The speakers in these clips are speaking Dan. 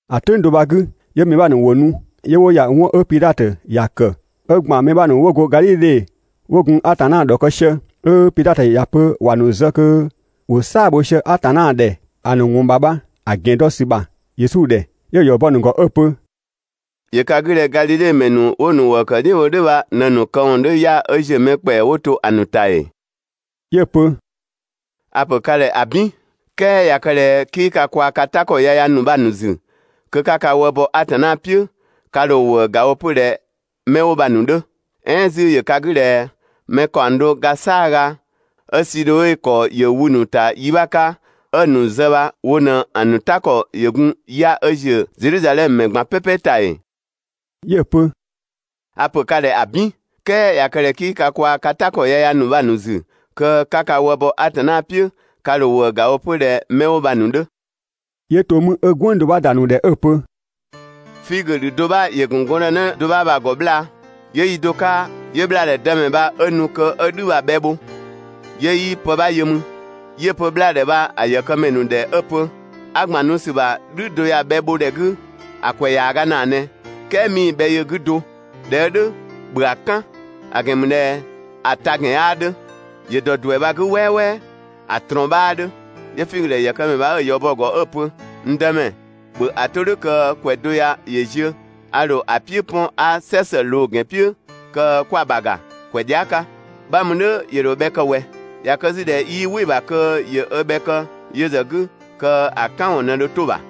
‑A "tʋ̈ng do bha‑ 'gü, 'yö mɛ 'bha ‑nu ‑wo nu 'yö 'wo ‑ya 'wɔn 'ö Pidhatö ‑ya ‑kë, 'ö ‑gban mɛ 'bha ‑nu 'wo go Gadhidhe 'wo gun Atanna ‑dhɔkë sië, 'ö Pidhatö ‑ya pö ‑wa ‑nu zë kö ‑wo "saa‑ bho sië Atanna ‑dhɛ ‑a ‑nu ‑wɔn ‑bha bha‑ ‑gɛn dɔ ‑sü ‑bha Yesu ‑dhɛ. 'Yö‑ ‑yɔ bɔ‑ ‑nu ‑gɔ 'ö‑ pö: «‑Yö ka 'gü ꞊dhɛ Gadhidhe ‑mɛ ‑nu 'wo‑ ‑nu ‑wëë ‑kë "dhiʋ̈ bho "dhʋ̈ bha ꞊në‑ ‑nu këwɔn 'dhö ya 'ö ‑ziö mɛ ‑kpɛa 'wo to ‑a ‑nu ‑ta ‑ee?» 'Yö‑ pö: «A‑ ‑pö ka ‑dhɛ ‑abin, "kɛɛ ꞊ya kë ꞊dhɛ 'kii ka kwaa‑ ka "ta ‑kɔ yaya ‑nu bha‑ ‑nu ‑zü, kö 'ka ka wë bɔ Atanna "piʋ̈, ka ‑dho ‑wëëga wo 'pö ꞊dhɛ 'mɛ 'wo bha‑ ‑nu 'dhö. "Ɛɛn 'zü ‑yö ka 'gü ꞊dhɛ mɛ ‑kaɔng do ga "saaga 'ö Sidhoe ‑kɔ ‑yö wü‑ ‑nu ‑ta yi 'bha 'ka 'ö‑ ‑nu zë bha wo ꞊në‑ ‑nu "ta ‑kɔ ‑yö gun 'ya‑ 'ö ‑ziö Zedhizadhɛmö ‑mɛ ꞊gban "pɛpɛ ‑ta ‑ee?» 'Yö‑ pö: «A‑ ‑pö ka ‑dhɛ ‑abin! "Kɛɛ ꞊ya kë ꞊dhɛ 'kii ka kwaa‑ ka "ta ‑kɔ yaya ‑nu bha‑ ‑nu ‑zü, kö 'ka ka wë bɔ Atanna "piʋ̈, ka ‑dho ‑wëë ‑ga wo 'pö ꞊dhɛ 'mɛ 'wo bha‑ ‑nu 'dhö.» 'Yö to 'mü 'ö "gwënng do 'bha ‑da ‑a ‑nu ‑dhɛ 'ö‑ pö: «Figö ‑dhü do 'bha ‑yö ‑gun gɔndënë do 'bha bha‑ ‑gɔ 'bhlaa. 'Yö yi do 'ka, 'yö 'bhlaadhɛ dëmɛ bha 'ö nu kö 'ö "dhü bha‑ bhɛ bho, 'yö 'yii pë 'bha yö mü. 'Yö‑ pö 'bhlaadhɛ bha‑ ‑yëkëmɛ ‑nu ‑dhɛ 'ö‑ pö: «'A ‑gban nu sü ‑bha "dhü do ya‑ bhɛ bho ‑dhɛ 'gü ‑a ‑kwɛ ‑yaaga ‑naa ꞊nɛ, "kɛɛ 'mii‑ bhɛ yö‑ 'gü do. ꞊Dhɛ 'ö "dhʋ̈, ‑bhö ‑a "kan; ‑a ‑gɛn ‑mü ꞊dhɛ ‑a ta ‑gɛn 'yaa 'dhö, ‑yö ‑dɔ ‑duɛ bha‑ 'gü "wɛɛwɛɛ, ‑a ꞊trɔɔn 'bhaa 'dhö.» 'Yö‑ figö ‑dhɛ ‑yëkëmɛ bha 'ö‑ ‑yɔ bɔ‑ ‑gɔ 'ö‑ pö: «N Dëmɛ, ‑bhö ‑a 'to "dhʋ̈ kö ‑kwɛ do ya ‑yö ziö, a ‑dho ‑a "piʋ̈ 'pɔn 'a "sɛ ‑së ꞊loo‑ ‑gɛn "piʋ̈ kö kwa‑ ‑bha ‑ga ‑kwɛ dhia" 'ka. 'Bha mü "dhʋ̈ ‑yö ‑dho bhɛ kë ꞊wɛ. ꞊Ya kë 'zü ꞊dhɛ 'yii "wɩ‑ ‑bha kö ‑yö ö bhɛ kë yö ‑zë 'gü, kö‑ "kan ‑wɔn ꞊në dho 'to‑ ‑bha.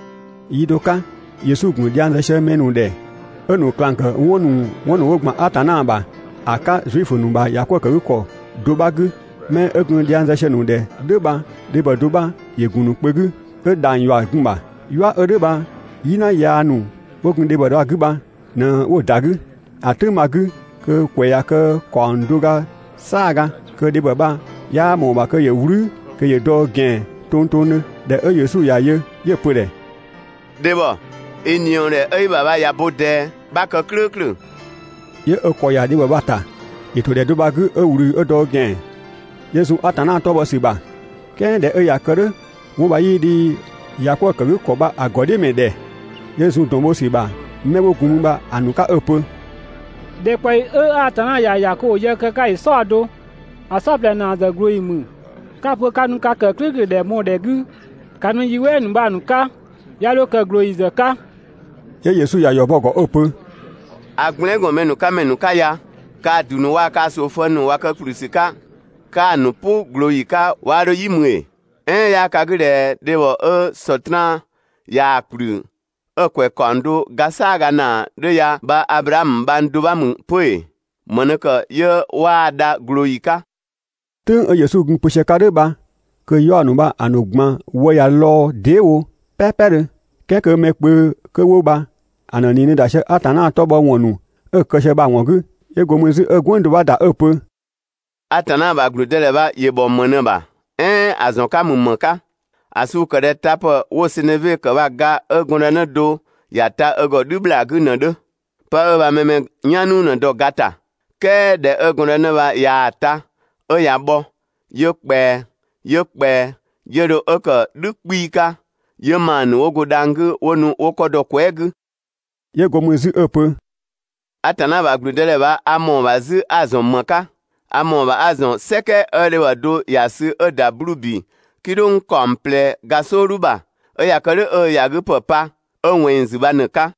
Yi do 'ka, Yesu ‑gun dhiang zë sië mɛ ‑nu ‑dhɛ 'ö‑ ‑nu ꞊klang ‑kë 'wɔn ‑nu 'wo ‑gban Atanna ‑bha ‑a 'ka Zuifö ‑nu ‑bha ‑yakwëëkëgükɔ do 'bha 'gü. 'Mɛ 'ö gun dhiang zë sië‑ ‑nu ‑dhɛ "dhʋ̈ bha, dhebhɔ do 'bha ‑yö ‑gun ‑nu kpö 'gü 'ö dhang‑ ‑yua ‑yö gun‑ ‑bha. "Yua 'ö "dhʋ̈ bha "yina yaa ‑nu 'wo gun dhebhɔ 'bha‑ 'gü ꞊në 'wo‑ ‑da 'gü. ‑A "tʋ̈ng bha‑ 'gü kö‑ ‑kwɛ ꞊ya kë ‑kaɔng do ga "saaga kö dhebhɔ bha 'yaa ꞊mɔɔ‑ ‑bha kö ‑yö "wlü kö ‑yö dɔ ö ‑gɛan tongtongdhö. ꞊Dhɛ 'ö Yesu ꞊ya yö 'yö‑ pö‑ ‑dhɛ: «Dhebhɔ, i ꞊niɔɔdhɛ 'ö i ‑bha bha ꞊ya bo ꞊dɛɛ, 'bha kë "klʋ̈ʋ̈klʋ̈!» 'Yö ö ‑kɔ ‑ya dhebhɔ bha‑ ‑ta. ‑Yö ‑to ‑dhɛ do bha‑ 'gü, 'ö ꞊wlü 'ö dɔ ö ‑gɛan, 'yö zun Atanna 'tɔ bhɔ ‑sü ‑bha. "Kɛɛ ꞊dhɛ 'ö ꞊ya kë "dhʋ̈, 'wɔn bha 'yii dhi ‑yakwëëkëgükɔ bha‑ ‑gɔdhiʋ̈mɛ ‑dhɛ, 'yö zun ‑dɔn bho ‑sü ‑bha 'mɛ 'wo gun mü bha‑ ‑nu 'ka 'ö‑ pö: «‑Dhɛkpaɔyi 'ö Atanna ‑ya ‑ya kö ‑wo yë kë‑ 'ka ‑yö "saɔdo, ‑a "saɔplɛ ‑naa ‑zë ꞊glooyi ‑mü. 'Ka‑ pö 'ka nu ka ‑kë "klʋ̈ʋ̈klʋ̈ ‑dhɛ mɔɔ‑ ‑dhɛ 'gü, ‑ka nu yi "wɛɛ ‑nu bha‑ ‑nu 'ka, 'ya 'dho kë ꞊glooyi ‑zë 'ka!» 'Yö Yesu ‑ya ‑yɔ bɔ‑ ‑gɔ 'ö‑ pö: «A gblɛɛn" ‑gɔn mɛ ‑nu 'ka ‑mɛ ‑nu 'ka ya! Kaa‑ ‑du ‑nu waa‑ kaa‑ ꞊soofëng ‑nu ꞊wa kë ‑kplü ‑sü 'ka 'kaa‑ ‑nu "pʋ ꞊glooyi 'ka 'waa 'dho "yi mü ‑ee?» "Ɛɛn 'yaa ka 'gü ꞊dhɛ dhebhɔ 'ö Sɔtraan ꞊yaa‑ ‑kplü 'ö‑ ‑kwɛ ‑kaɔng do ga "saaga ‑naa 'dhö ya bha, Ablaamö bhang do 'bha ‑mü 'pö ‑ee? ‑Më ꞊në ‑kë 'yö 'waa‑ dha ꞊glooyi 'ka?» "Tʋ̈ng 'ö Yesu gun‑ pö sië‑ 'ka "dhʋ̈ bha kö‑ 'yaɔ‑ ‑nu bha‑ ‑nu ꞊gban wë ꞊ya lɔɔ‑ dee" wo "pɛɛpɛdhö, "kɛɛ kö mɛ kpö kö 'wo bha‑ ‑nu ꞊nii ꞊në ‑da sië Atanna 'tɔ bhɔ ‑wɔn ‑nu 'ö‑ kë sië bha‑ ‑wɔn 'gü. 'Yö go mü 'zü 'ö "gwënng do 'bha ‑da 'ö‑ pö: «Atanna ‑bha ‑gblüdëdhɛ bha ‑yö ‑bhɔ ‑më ꞊në‑ ‑bha, "ɛɛn ‑a ‑zɔn 'ka ‑mü ‑më 'ka? ‑A suu‑ ‑kë ꞊dhɛ tapë 'wo‑ seneve ‑kë bha‑ ga 'ö gɔndënë do ‑ya ta ö ‑gɔ "dhü ‑bhlaa 'gü ꞊në‑ 'dhö. (Pë 'ö bha mɛ‑ mɛ "yan "nuu ꞊në‑ dɔ‑ ga ‑ta.) "Kɛɛ ꞊dhɛ 'ö gɔndënë bha ꞊yaa‑ ta, 'ö ꞊ya bhɔ, 'yö ꞊kpɛa, 'yö ꞊kpɛa, 'yö 'dho ö ‑kë "dhü 'kpii‑ 'ka, 'yö ‑maa ‑nu 'wo go dhang‑ 'gü 'wo nu 'wo 'kɔ dɔ‑ kwɛɛ" 'gü.» 'Yö go mü 'zü 'ö‑ pö: «Atanna ‑bha ‑gblüdëdhɛ bha a ‑mɔɔ ‑bha 'zü 'a‑ ‑zɔn ‑më 'ka? A ‑mɔɔ ‑bha 'a‑ ‑zɔn "sɛkɛ 'ö dhebhɔ do ‑ya sü 'ö‑ ‑da 'bluu‑ ‑bi "kidhʋng ‑kaɔng ꞊plɛ ga "sɔɔdhu ‑bha, 'ö ꞊ya kë "dhʋ̈ 'ö ö ‑yagüpë pa 'ö ꞊wɛnng ‑zü bha ꞊në‑ 'ka.»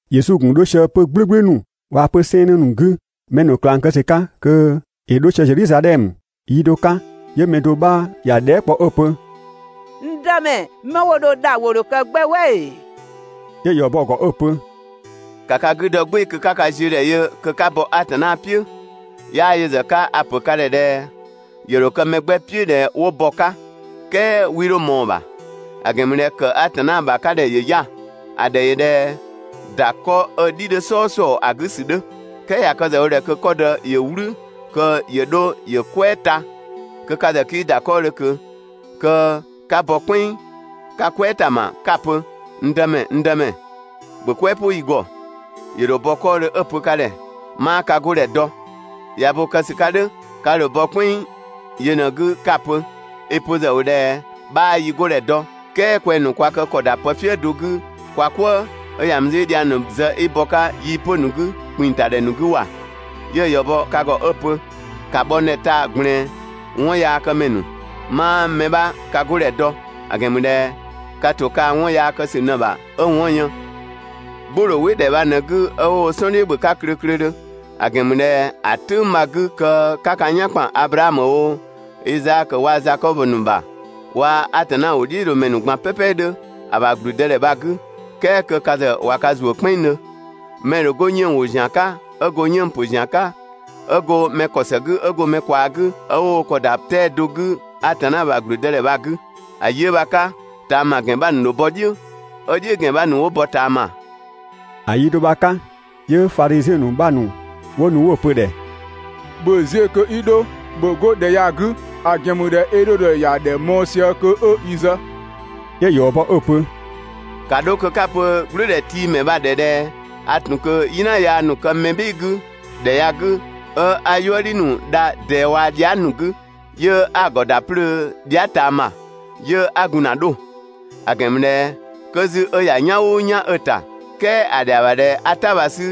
Yesu ‑gun 'dho sië 'pö‑ "gblʋ̈gblʋ̈ ‑nu waa‑ 'pö‑ 'sɛɛnnë ‑nu 'gü mɛ ‑nu ꞊klang kë ‑sü 'ka kö ‑yö 'dho sië Zedhizadhɛmö. Yi do 'ka, 'yö mɛ do 'bha ‑ya dhɛɛ" kpɔ 'ö‑ pö: «N Dëmɛ, 'mɛ 'wo dho dha ‑wo ‑dho kë 'gbɛ "wɛ ‑ee?» 'Yö‑ ‑yɔ bɔ‑ ‑gɔ 'ö‑ pö: «‑Ka ka 'gü dɔ "gbɩɩ‑ kö 'ka ka ziö ‑dhɛ yö (kö 'ka bɔ Atanna "piʋ̈), 'yaa yö ‑zë 'ka a‑ ‑pö ka ‑dhɛ ꞊dhɛ ‑yö ‑dho kë mɛ 'gbɛ "piʋ̈ ꞊dhɛ 'wo bɔ‑ 'ka, "kɛɛ 'wii 'dho ꞊mɔɔ‑ ‑bha; ‑a ‑gɛn ‑mü ꞊dhɛ ‑kë Atanna ‑bha 'ka ‑dhɛ ‑yö 'ya‑. ‑A ‑dhɛ ‑yö ꞊dhɛ ‑da 'kɔ 'ö‑ "dhi 'dhö "sɔɔsɔɔ ‑a 'gü ‑sü 'dhö. "Kɛɛ ꞊ya kë ‑zë wo ꞊dhɛ kö 'kɔdë ‑yö "wlü kö ‑yö 'dho ‑yö "kwɛɛ ta, kö ka ‑zë 'kii ‑da 'kɔɔdhö ꞊kö, kö 'ka bɔ "kpɛnng 'ka "kwɛɛ ‑ta ‑ma 'ka‑ pö: «N Dëmɛ, n Dëmɛ, ‑bhö "kwɛɛ "pʋ yi ‑gɔ! ‑Yö ‑dho bɔ 'kɔɔdhö 'ö‑ pö ka ‑dhɛ: «'Maa ka 'godhɛ dɔ.» ꞊Ya bo kë ‑sü 'ka "dhʋ̈, ka ‑dho bɔ "kpɛnng yö ꞊në‑ 'gü 'ka‑ pö: «I‑ pö ‑zë ‑wo ꞊dhɛ 'bhaa yi 'godhɛ dɔ, "kɛɛ kwɛng‑ ‑nu kwa kë ‑kɔ ‑da pëfië do 'gü kwa "kwëë, 'ö ‑ya mü 'zü 'i dhiang ‑nu zë 'i bɔ‑ 'ka yii‑ 'pö‑ ‑nu 'gü, ‑kpinng ‑ta ‑dhɛ ‑nu 'gü ‑wa! 'Yö‑ ‑yɔ bɔ ka ‑gɔ 'ö‑ pö: «‑Ka bhɔ n 'ka taa‑ ꞊gblɛɛn, 'wɔnyaakëmɛ ‑nu! 'Maa mɛ 'bha ka 'godhɛ dɔ; ‑a ‑gɛn ‑mü ꞊dhɛ ka ‑to kaa‑ 'wɔn yaa kë ‑sü ꞊në‑ ‑bha 'ö‑ 'wɔn‑ yën. "Gbʋ‑ ‑dho "wɩ ‑dhɛ bha ꞊në‑ 'gü, 'ö 'wo wo "sɔn "dhiʋ̈ ‑bhö klöklödhö, ‑a ‑gɛn ‑mü ꞊dhɛ ‑a "tʋ̈ng bha‑ 'gü kö 'ka ka "yan ‑kpan Ablaamö oo, Izaakö waa‑ Zakɔbö ‑nu ‑bha, waa‑ Atanna ‑wʋdhiʋ̈loomɛ ‑nu ꞊gban "pɛpɛ 'dhö ‑a ‑bha ‑gblüdëdhɛ bha‑ 'gü, "kɛɛ kö ka ‑zë ꞊wa ka ‑zuö "kpɛnngdhö. Mɛ‑ ‑dho 'go 'yënng‑ ‑wo ‑zian 'ka, 'ö go 'yënng‑ ‑pö ‑zian 'ka, 'ö go mɛ ‑kɔ ‑së 'gü, 'ö go mɛ ꞊kwaa 'gü, 'ö 'wo wo ‑kɔ ‑da 'tɛa‑ do 'gü Atanna ‑bha ‑gblüdëdhɛ bha‑ 'gü. ‑A yi 'ö bha‑ 'ka, ꞊taama ‑gɛn 'bha ‑nu ‑dho bɔ "dhiʋ̈, 'ö "dhiʋ̈ ‑gɛn 'bha ‑nu 'wo bɔ ꞊taama.» ‑A yi do bha‑ 'ka, 'yö Fadhiziɛn ‑nu 'bha ‑nu 'wo nu 'wo‑ pö‑ ‑dhɛ: «‑Bhö ziö kö 'i 'dho, ‑bhö 'go ‑dhɛ ya‑ 'gü, ‑a ‑gɛn ‑mü ꞊dhɛ Edhodö ‑ya ‑dhɛ mɔɔ‑ sië kö 'ö i zë.» 'Yö‑ ‑yɔ bɔ 'ö‑ pö: «‑Ka 'dho kö 'ka‑ pö "gblʋ̈ʋ̈dhɛtiimɛ bha‑ ‑dhɛ ꞊dhɛ a ‑tun kö "yina yaa ‑nu kë mɛ "bhɩɩ‑ 'gü ‑dhɛ ya‑ 'gü, 'ö 'a "yuëdhi ‑nu dha ꞊dɛɛ waa‑ dhia" ‑nu 'gü 'yö 'a‑ ‑gɔ ‑da 'plöö dhia" ꞊taama, 'yö 'a gun ‑na 'dho‑. ‑A ‑gɛn ‑mü ꞊dhɛ 'kö 'zü 'ö ‑ya "yan "ʋʋ "yan 'ö‑ ‑ta, "kɛɛ ‑a ‑dhɛa ‑bha ꞊dhɛ 'a "ta bha‑ 'sü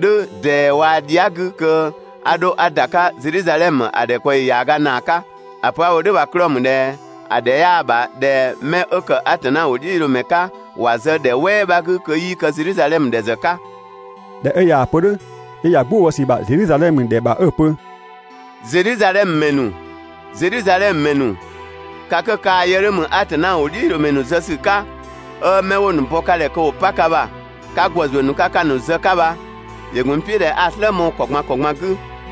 "dhʋ̈ ꞊dɛɛ waa‑ dhia" 'gü kö 'a 'dho 'a ‑da 'ka Zedhizadhɛmö ‑a ‑dhɛkpaɔyi ‑yaaga ‑naa 'ka, ‑a pö 'a‑ wo "dhʋ̈ bha‑ 'klɔɔ‑ ‑mü ꞊dhɛ ‑a ‑dhɛ 'yaa ‑bha ꞊dhɛ 'mɛ 'ö ‑kë Atanna ‑wʋdhiʋ̈loomɛ 'ka ‑wa zë ‑dhɛ "wɛɛ 'bha 'gü kö 'yii kë Zedhizadhɛmö ‑dhɛ ‑zë 'ka.» ꞊Dhɛ 'ö ꞊yaa‑ pö "dhʋ̈, 'yö ‑ya "gbʋ bɔ ‑sü ‑bha Zedhizadhɛmö ‑dhɛ ‑bha 'ö‑ pö: «Zedhizadhɛmö ‑mɛ ‑nu, Zedhizadhɛmö ‑mɛ ‑nu, ka 'kö kaa‑ yë 'dhö ‑mü Atanna ‑wʋdhiʋ̈loomɛ zë ‑sü 'ka, 'ö 'mɛ 'wo‑ ‑nu bɔ ka ‑dhɛ kö ‑wo 'pa ka ‑bha 'ka ‑gwë ‑zuö ‑nu 'ka‑ ‑nu zë‑ 'ka bha, ‑yö ‑gun n "piʋ̈ ꞊dhɛ 'a‑ "slë mɔɔ‑ ‑kɔ ꞊gban ‑kɔ ꞊gban 'gü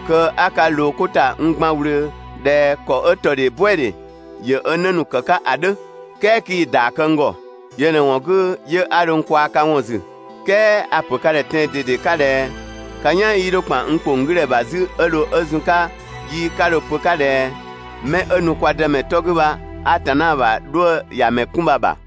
kö 'a ka ꞊loo 'ko ‑ta n gban ꞊wlöö ꞊dhɛ ‑kɔ 'ö ‑tɔdhee "buɛdhe ‑yö ö 'në ‑nu ‑kë 'ka ‑a 'dhö, "kɛɛ 'kii‑ ‑yɔ bɔ n ‑gɔ! Yö ꞊në‑ ‑wɔn 'gü, 'yö 'a dho n kwaa‑ ka ‑wɔn ‑zü, "kɛɛ a‑ ‑pö ka ‑dhɛ tɛan‑ ꞊dede 'ka ꞊dhɛ ka "yan 'yii 'dho ‑kpan n ‑kpong 'gü ‑dhɛ ‑bha 'zü 'ö dho 'ö zun‑ 'ka yi 'ka dho‑ pö‑ 'ka ꞊dhɛ: «'Mɛ 'ö nu kwa Dëmɛ 'tɔ 'gü bha, Atanna ‑bha 'dhuë‑ ‑ya ‑mɛ 'kun!» bha‑ ‑bha.»